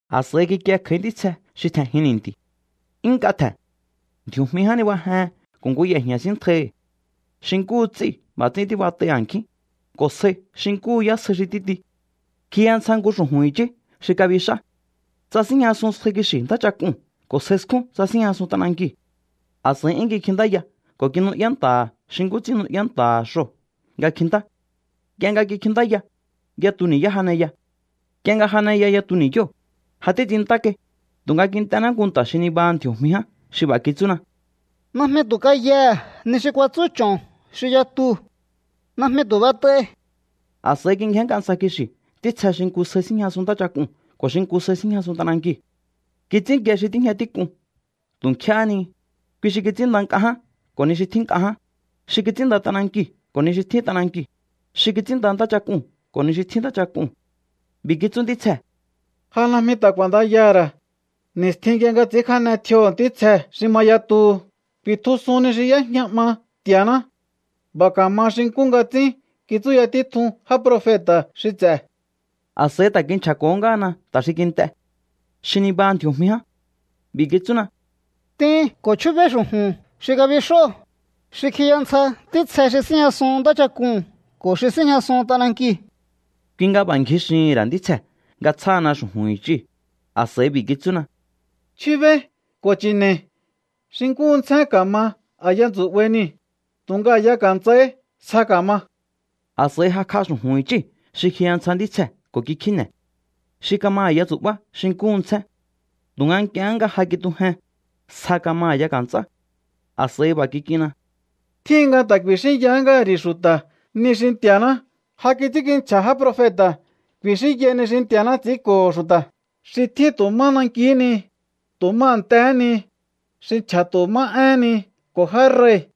A̱s'a̱i kikie kj'a̱í ntítsje xi tje̱njin ni̱nti̱. 'Yún nk'a tje̱n. Ndji̱o̱jmi ján nibajehen ko̱ nku ye̱jña̱ síntjaihi̱. Xi nkúhu ts'íu̱ b'a̱ ts'ín tíbat'ai a̱nkjín, ko̱ sjai xi nkúhu yásjai xi títi. Kjiya ntsja nku xu̱ju̱n i̱chí xi kabix'á. Tsasíjñasun sjai kixi̱ ntáchak'uu̱n ko̱ sjai skjún tsasíjñasun t'anankiu̱. A̱s'a̱i 'yún kikjintáya ko̱ kinu'yá nta̱ha̱ xi nkú ts'ín nu'yá nta̱ha̱ xoo̱ nga kjintá. Nk'ie nga kikjintáya, yatu ni̱yá janeya. Nk'ie nga janeya yatu ni̱yóo̱, ja títs'inntá kai, tu̱nga kint'ená nku nta̱ xi nibaha ndji̱o̱jmi ján xi b'a̱ kitsúna: —Najmi tu̱ kayaha̱ ni xi kuatsú ch'o̱n xi yatuu̱. Najmi tu̱ b'et'ai. A̱s'a̱i kingjénnk'a ntsja kixi̱ ntítsje xi nku sjai síjñasun ntáchak'uu̱n ko̱ xi nku sjai síjñasun t'anankiu̱. Kits'ínkie xi tíjña tík'un tu̱ nkjéhé ni, kui xi kits'ínnda nk'a ján ko̱ ni xi tjín nk'a ján, xi kits'ínnda t'anankiu̱ ko̱ ni xi tjín t'anankiu̱, xi kits'ínnda ntáchak'uu̱n ko̱ ni xi tjín ntáchak'uu̱n. B'i̱ kitsú ntítsjee̱: —Ja najmi ta̱ k'u̱a̱ndayaha̱ ra̱. Ni̱stjin nk'ie nga ts'i̱ínkjane tjioho̱ ntítsje xi ma yatuhu ku̱i̱tjusun ni xi y'éjña 'ma Nti̱a̱ná. B'a̱ ka̱ma xi nkú nga ts'ín kitsúya títjuhu̱n já profeta̱ xi ts'e̱. A̱s'a̱i ta̱ kinchja̱ko̱hó ngáhana nta̱ xi kint'e, xi nibaha ndji̱o̱jmi ján. B'i̱ kitsúna: —T'in ko̱ chjúbéí xu̱ju̱n xi kabix'óo̱, xi kjiya ntsja ntítsje xi síjñasun ntáchak'uu̱n ko̱ xi síjñasun t'anankiu̱. Kui nga b'a̱ ngji xihi̱n ra̱ ntítsjee̱ nga tsjáhana xu̱ju̱n i̱chíu̱. A̱s'a̱i b'i̱ kitsúna: —Chjúbéí ko̱ chi̱ne̱i̱. Xi nkúhu ntsjén ka̱ma a̱ya tsu̱'bai niu̱, tu̱nga a̱ya ka̱nts'ai sja ka̱ma. A̱s'a̱i jakj'a xu̱ju̱n i̱chí xi kjiya ntsja ntítsjee̱ ko̱ kikjíne̱. Xi kama a̱ya tsu̱'bá xi nkúhu ntsjén. Tu̱nga nk'ie nga ja kitujen, sja kama a̱ya ka̱nts'á. A̱s'a̱i b'a̱ kik'inna: —Tjíhin nga ta̱ ku̱i̱xínya ngáha̱ ri̱ xu̱ta̱ ni xi Nti̱a̱ná ja kits'ínkinchja̱ já profeta̱. Ku̱i̱xínyai ni xi Nti̱a̱ná ts'i̱ínko̱ xu̱ta̱ xi tjín tu̱ má nankihí ni, tu̱ má a̱ntjehé ni, xi nchja̱ tu̱ má éhén ni ko̱ já rei̱.